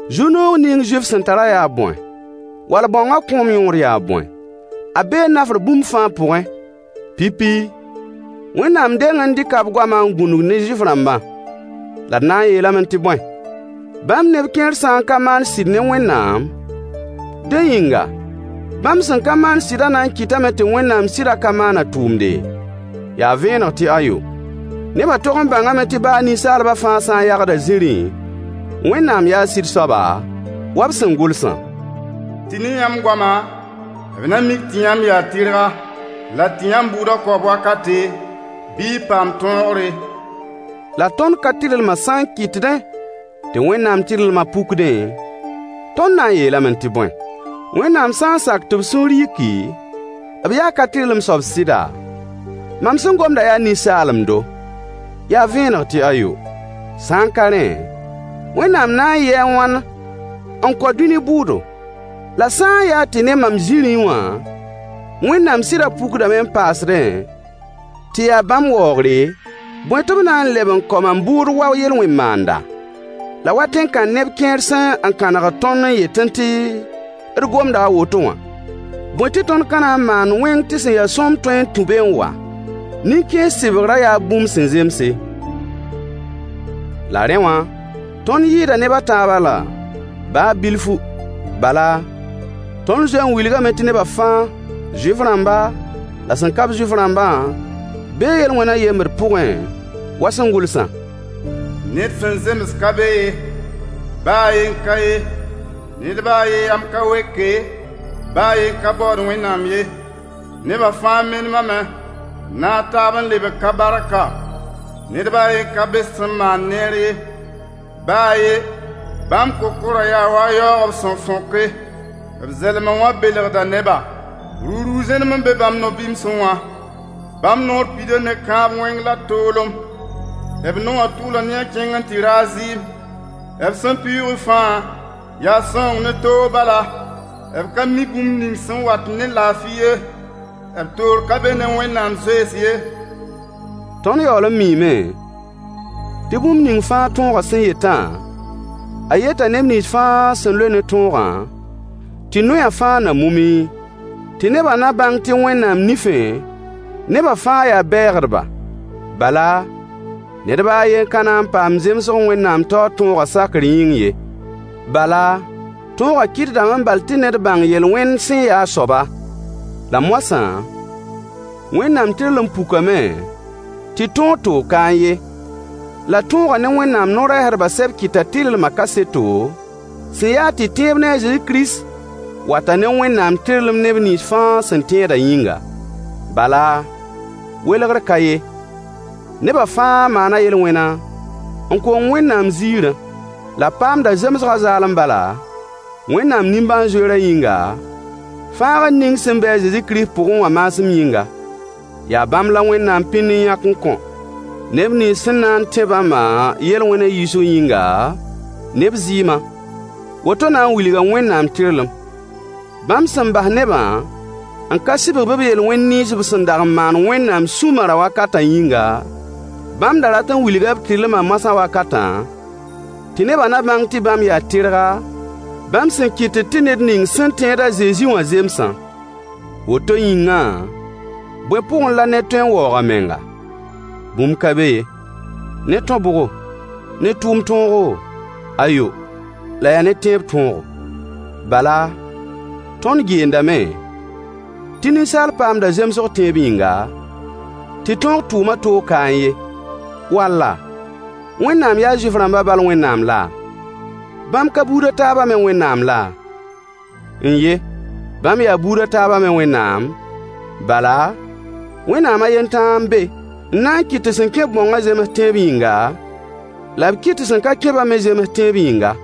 Zu-noog ning Zuif sẽn tarã yaa bõe, wall bãongã kõom yõod yaa bõe? A bee nafr bũmb fãa pʋgẽ. Pipi, Wẽnnaam deng n dɩka b goamã n gũnug ne Zuif-rãmbã. La d na n yeelame tɩ bõe? Bãmb neb kẽer sã n ka maan sɩd ne Wẽnnaam, dẽ yĩnga, bãmb sẽn ka maan sɩdã na n kɩtame tɩ Wẽnnaam sɩdã ka maan a tʋʋmde? Yaa vẽeneg tɩ ayo. Nebã tog n bãngame tɩ baa ninsaalbã fãa sã n yagda zĩrĩ, Wẽnnaam yaa sɩd-soaba, wa b sẽn gʋlsã: Tɩ ne yãmb goama, b na mik tɩ yãmb yaa tɩrga, la tɩ yãmb bʋʋda kaoob wakate, bɩ y paam tõogre. La tõnd ka-tɩrlmã sã n kɩtdẽ tɩ Wẽnnaam tɩrlmã pukdẽ, tõnd na n yeelame tɩ bõe? Wẽnnaam sã n sak tɩ b sũur yiki, b yaa ka-tɩrlem soab sɩda? Mam sẽn gomda yaa ninsaalemdo. Yaa vẽeneg tɩ ayo. Sã n ka rẽ, Wẽnnaam na n yɩɩ a wãn n kao dũni bʋʋdo? La sã n yaa tɩ ne mam zĩrĩ wã Wẽnnaam sɩdã pukdame n paasde tɩ ya bãmb waoogre, bõe tɩ b na n leb n kao mam bʋʋd wa yel-wẽn maanda? La wa tẽn-kãn-neb kẽer sẽn kãnegd tõnd n yetẽ tɩ d gomda a woto wã, bõe tɩ tõnd ka na n maand wẽng tɩ sẽn ya sõmb tõe n tũ be n wa? Nin-kãens sɩbgrã yaa bũmb sẽn zemse. La rẽ wã, tõnd yɩɩda neb a taabã la? Baa bilfu! Bala, tõnd zoe n wilgame tɩ nebã fãa, Zuif-rãmba la sẽn ka-b Zuif-rãmbã bee yel-wẽnã yembd pʋgẽ wa sẽn gʋlsã: Ned sẽn zems ka be ye! Baa a yen ka ye. Ned baa a yen yam ka weke, baa a yen ka baood Wẽnnaam ye. Neba fãa menemame, n naag taab n lebg ka-barka. Ned baa a yen ka be sẽn maand neer ye, baa a ye! Bãmb kokorã yaa wa yaoog b sẽn fõke. B zɛlmã wã belgda neba. Ruruug zẽnem n be bãmb no-bɩmsẽ wã. Bãmb noor pida ne kãab-wẽng la toolem. B naowã tʋʋla ne a kẽng n tɩ raag zɩɩm. B sẽn pɩʋʋgẽ fãa, yaa sãoong ne toog bala. B ka mi bũmb ning sẽn wat ne laafɩ ye. B toor ka be ne Wẽnnaam zoees ye. Tõnd yaool n miime tɩ bũmb ning fãa tõogã sẽn yetã, a yeta neb nins fãa sẽn loe ne tõogã, tɩ noyã fãa na mume, tɩ nebã na bãng tɩ Wẽnnaam nifẽ, nebã fãa yaa bɛɛgdba. Bala, ned baa a yen ka na n paam zemsg Wẽnnaam taoor tõogã sakr yĩng ye, bala, tõogã kɩtdame bal tɩ ned bãng yel-wẽnd sẽn ya a soaba. La moasã Wẽnnaam tɩrlem pukame tɩ tõog toog kaẽ ye, la tõogã ne Wẽnnaam no-rɛɛsdbã sɛb kɩta tɩrlmã kaseto, sẽn yaa tɩ tẽeb ne a Zezi Kirist wata ne Wẽnnaam tɩrlem neb nins fãa sẽn tẽedã yĩnga. Bala, welgr ka ye: Nebã fãa maana yel-wẽna, n kong Wẽnnaam ziirã. La b paamda zemsgã zaalem bala, Wẽnnaam nimbãan-zoeerã yĩnga, fãagr ning sẽn be a Zezi Kirist pʋgẽ wã maasem yĩnga. Yaa bãmb la Wẽnnaam pĩnd n yãk n kõ, neb nins sẽn na n tẽ bãmbã yel-wẽna yiisg yĩnga, ne b zɩɩmã. Woto na n wilga Wẽnnaam tɩrlem. Bãmb sẽn bas nebã n ka sɩbg-b b yel-wẽn nins b sẽn dag n maan Wẽnnaam sũ-marã wakatã yĩnga, bãmb da rat n wilga b tɩrlmã moasã wakatã, tɩ nebã na bãng tɩ bãmb yaa tɩrga, bãmb sẽn kɩtd tɩ ned ning sẽn tẽed a Zezi wã zemsã. Woto yĩngã, bõe pʋgẽ la ned tõe n waoog a menga? Bũmb ka be ye. Ne tõ-bʋgo? Ne tʋʋm tõogo? Ayo! La yaa ne tẽeb tõogo. Bala, tõnd geendame tɩ ninsaal paamda zemsg tẽeb yĩnga, tɩ tõog tʋʋmã toog kaẽ ye. Walla, Wẽnnaam yaa Zuif-rãmbã bal Wẽnnaam la? Bãmb ka buud a taabã me Wẽnnaam la? N-ye, bãmb yaa buud a taabã me Wẽnnaam, bala, Wẽnnaam a yen tãa n be n na n kɩt tɩ sẽn kẽ-b bãongã zems tẽeb yĩnga, la b kɩt tɩ sẽn ka kẽ-bã me zems tẽeb yĩnga.